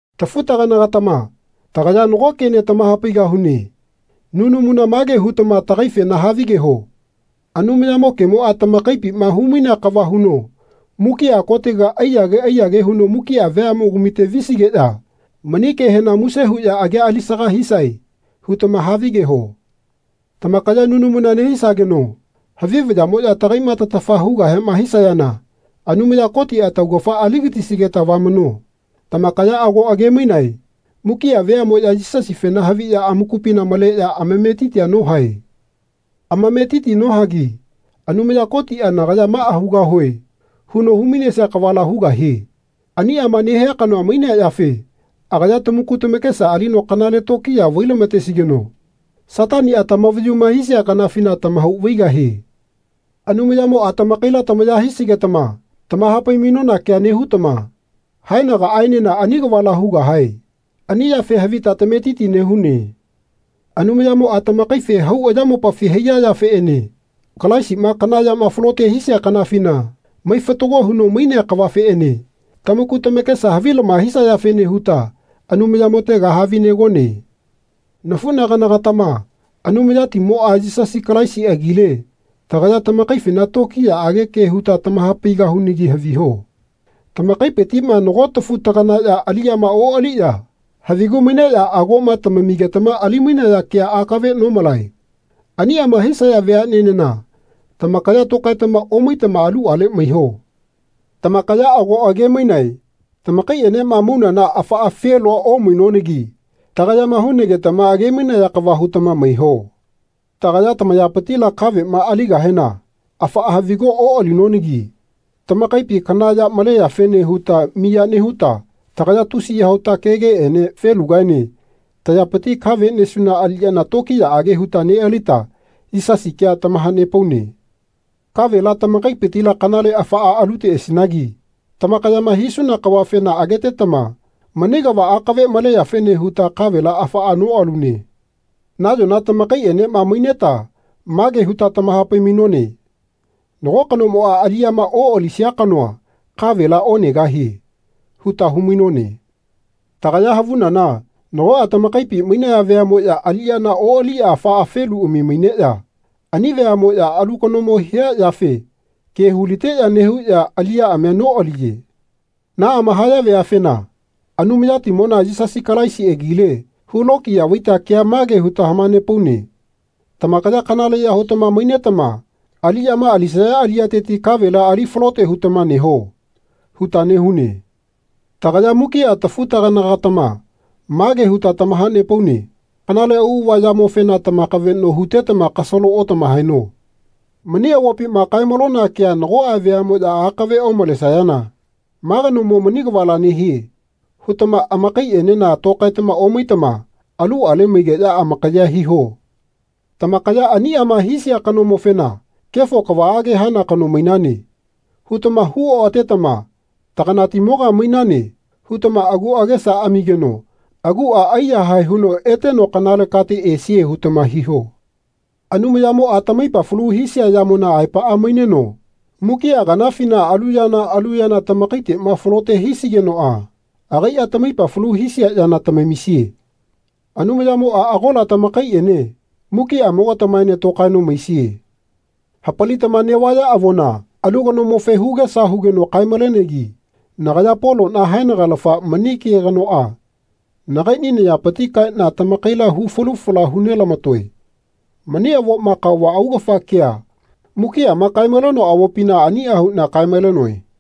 Tafu-tagana-gatama tagaya nago kene tamahapaigahune. Nunamuna mage hutama tagaifena havigeho Anumayamo kemoa tamakaipima humainea kava huno mukia kotega aiyage aiyage huno mukia veamogamite visigeya mani kehena muse huya agia alisaga hisae hutama havigeho. Tamakaya nunamuna nehisageno havi vayamoya tagaima tatafa hugahema hisayana Anumaya Kotia taugafa aligatisigeta vamano. Tamakaya ago age-mainae mukia veamoya Yisasifena haviya amakupina maleya amametiti nohae. Amametiti nohagi Anumaya Kotia Nagaya maa hugahue. huno humainesia kavala hugahie. Aniama nehia kanoa mainea yafe agaya tamaku tamakesa alino kanale tokiya vai-lamatesigeno Satania tamavayuma hisia kanafina tamahau vaigahie. Anumayamoa tamakaila tamaya hisigetama tamahapai-mainona kea nehutama haenagaaenena ani kavala hugahae ani yafe havita tametiti nehune. Anumayamoa tamakaife hau ayamopafi haiya yafeene Kalaisima kana yama falote hisia kanafina mai fatago huno mainea kavafeene tamaku tamakesa havilama hisayafene huta Anumayamotega havinegone. Nafunagana-gatama Anumayatimoa, Yisasi Kalaisi agile tagaya tamakaifena tokiyaage ke huta tamahapaigahunagi haviho. Tamakaipitima nagoa tafu-taganaya aliyama oaliya havigu maineya agoma tamamigetama ali-mainaya kea akave nomalae. Aniama hisaya veanenena tamakaya tokaetama omaitama aluale maiho. Tamakaya ago age-mainae tamakaienema maunana afaa felua omainonagi tagayama hunagetama age-mainaya kava hutama maiho. Tagaya tamayapitila kavema aligahena afaa havigua oalinonagi tamakaipi kana ya maleyafene huta miya nehuta tagaya tusiya huta kegeene felugaene tayapiti kave nesuna aliyana tokiyaage huta nealita Yisasi kea tamahanepaune. Kavela tamakaipitila kanale afaa aluteasinagi tamakayama hisuna kavafena agetetama mani kava akave maleyafene huta kavela afaa noalune. Nayona tamakaienema maineta mage huta tamahapai-mainone Nago kanomoa aliyama oalisia kanoa kavela onegahie. huta humainone. Tagaya havunana nagoa tamakaipi mainaya veamoya aliyana oaliya afaa feluami maineya ani veamoya alu kanomo hia yafe ke hu-liteya nehuya aliyaamia noaliye. Naama haya veafena Anumayatimona Yisasi Kalaisi agile hulokiya vaita kea mage huta hamanepaune Tamakaya kanaleya hutama mainetama aliyama alisaya aliyateti kavela ali falote hutama neho. huta nehune. Tagaya mukia tafu-tagana-gatama mage huta tamahanepaune kanale auava yamofena tamakaveno hutetama kasalo otamahaeno. Mani avopima kae-malona kea nagoa veamoya akave omalesayana Ma kanomo mani kavala nehie. hutama amakaienena tokaetama omaitama aluale maigeya amakayea hino. Tamakaya aniama hisia kanomofena Kefo kavaage hana kano mainane. hutama hu oatetama Taganatimoga mainane. hutama agu agesa amigeno agua aiyahae huno eteno kanale kate esie hutama hiho. Anumayamoa tamaipa falu hisia yamona aepaa maineno mukia kanafina alu yana alu yana tamakaitema falote hisigenoa agaia tamaipa falu hisia yana tamamisie. Anumayamoa agola tamakaiene mukiamo-gatamaene tokaeno maisie. Hapalitama nevaya avona alu kanomofe hugesa hugeno kae-malenegi nagaya Polona haenagalafa mani ke kanoa nagaini nayapiti kaena tamakaila hu falu fala hu nelamatoe. Mani avoma kaova augafa kea mukiama kae-malenoa avopina ania huna kae-malenoe.